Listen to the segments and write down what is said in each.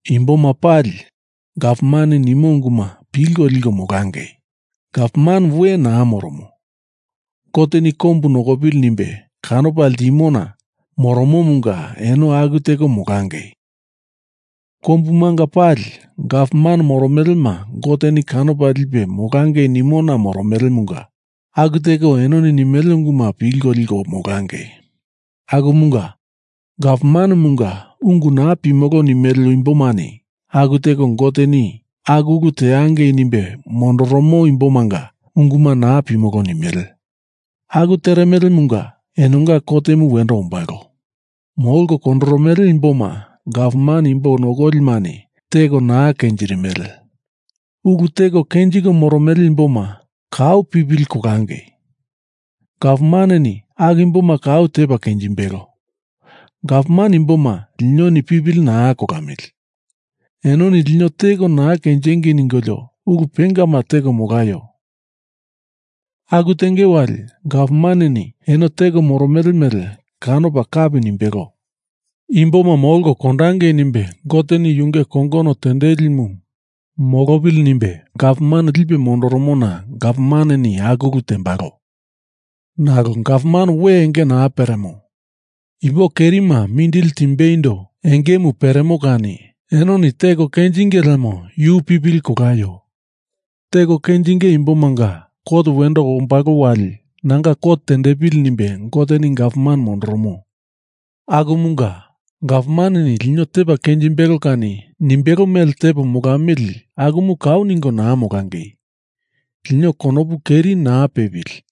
Imboma pali gavmaneni nimo unguma pilko liko molangei. Gavman we naa moromo. Goteni kombu nokopili nimbe kanopa ltimona moromomunga eno aku teko molangei. Kombumanga pali gavman moromelema Goteni kanopa lipe molangei nimona moromelemunga aku teko enoni nimele unguma pilko liko molangei. Akumunga, gavmanemunga ungu naa pimolo nimele imbomani aku teko Goteni aku ulu teangei nimbe mondoromo imbomanga unguma naa pimolo nimele. Aku teremelemunga enonga kotemu wendo ombalo. Molko kondoromele imboma gavman imbo nokolimani teko naa kenjirimele. Ulu teko kenjiko moromele imboma kau pipili kolangei. Gavmaneni aku imboma kau tepa kenjimbelo. Gavman imboma linoni pipili naa kolamili. Enoni lino teko naa kenjingei ningolio ulu pengama teko molaio. Aku tenge wali gavmaneni enoni teko moromele mele kanopa kapi nimbelo. Imboma molko kondangei nimbe Goteni Yunge kongono tendelimu molopili nimbe gavman lipe mondoromona gavmaneni aku ulu tembalo. Nalo gavman we enge naa peremo. Imbo kerima mindili timbeindo engemu peremo kani enoni teko kenjinge lemo yu pipili kolaio. Teko kenjinge imbomanga kot wendo ombalo wali nanga kot tendepili nimbe Goteni gavman mondoromo. Akumunga gavmaneni lino tepa kenjimbelo kani nimbelo mele tepo molamili akumu kau ningo naa molangei. Lino konopu keri naa pepili,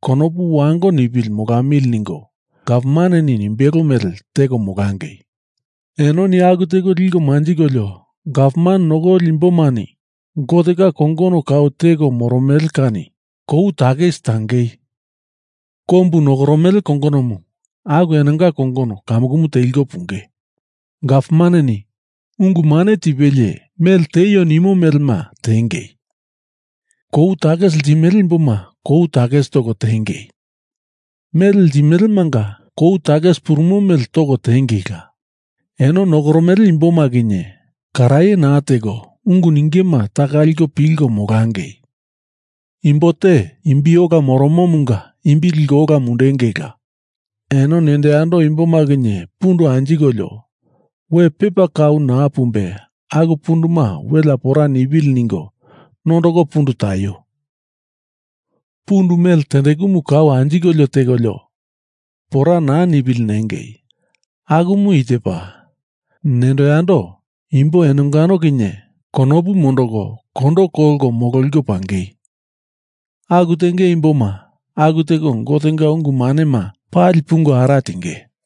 konopu wango nipili molamili ningo gavmaneni nimbelo mele teko molangei. Enoni aku teko liko manjikolio gavman nokoli imbomani Gotenga kongono kau teko moromele kani kou takis tangei. Kombu nokoromele kongonomu aku enonga kongono kamukumu teliko punge. Gavmaneni ungu mane tipelie mele tieio nimo melema tiengei. Kou takis ltimele imboma kou takis toko tiengei. Mele ltimelemanga kou takis purumo mele toko tiengeila. Eno nokoromele imboma kinye karaye naa teko ungu ningema taka liko pilko molangei. Imbo te imbi ola moromomunga imbi liko ola mundengeila. Eno nendo yando imboma kinye pundu anjikolio we pepa kau naa pumbe aku punduma welea pora nipili ningo nondoko pundu taio. Pundu mele tendekumu kau anjikolio tekolio pora naa nipili nengei. Akumu i tepa: Nendo yando imbo eno enongano kinye konopu mondoko kondo kolko mololiko pangei. Aku tenge imboma aku teko Gotenga ungu manema pali pungo ara tinge.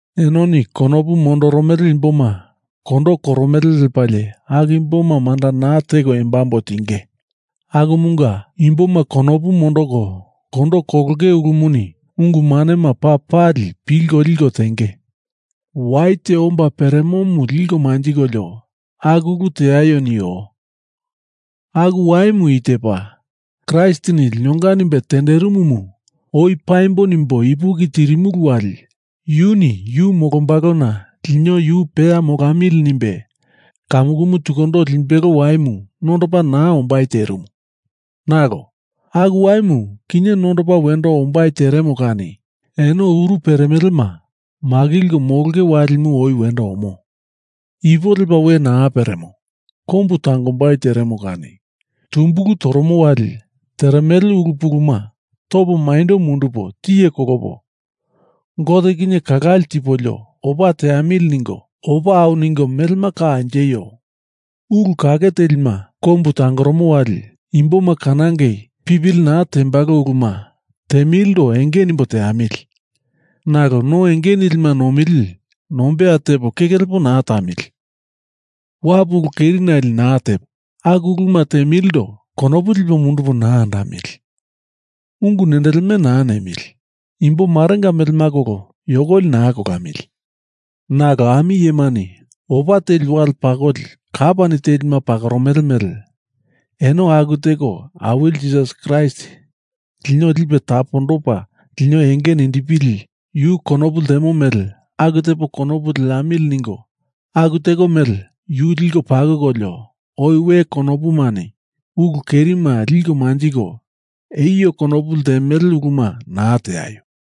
Enoni konopu mondoromele imboma kondo koromele lepalie aku imboma manda naa teko embambo tinge. Akumunga imboma konopu mondoko kondo kolonge ulumuni ungu manema paa pali pilko liko tenge. Wai te omba peremomu liko manjikolio aku ulu teaio nio. Aku waimu i tepa: Kraistini linonga nimbe tenderimumu oi paimbo nimbo ipuki tirimulu wali yuni yu molombalona lino yu peya molamili nimbe kamukumu tukundo limbelo waimu nondopa naa ombai terimu, nalo aku waimu kinye nondopa wendo ombai teremo kani eno uru peremelema makilko molonge walimu oi wendo omo. Ipo lepa we naa peremo. Kombu tangombai teremo kani tumbulu toromo wali teremele ulu puluma topo maindo mundupo tiye kolopo, Gote kinye kalale tipolio opa teamili ningo opa au ningo melema ka anjeio. Ulu kake telima kombu tangoromo wali imboma kanangei pipili naa tembalo uluma temilindo enge nimbo teamili. Nalo no enge nilima nomili nombeya tepo keke lepo naa tamili. Wapu ulu kerinale naa tepo, aku uluma temilindo konopu lipo mundupo naa andamili. Ungu nendeleme naa nemili. Imbomarenga melema kolo yokoli naa kolamili. Nalo ami iyemani opa teli wali pakoli kapani telima pakoromele mele eno aku teko Awili Jisas Kraist lino lipe tapondopa lino enge nindipili, Yu konopu ltemo mele aku tepo konopu leamili ningo aku teko mele Yu liko pakokolio, oi we konopumani ulu kerima liko manjiko eio konopu ltemele uluma naa teaio.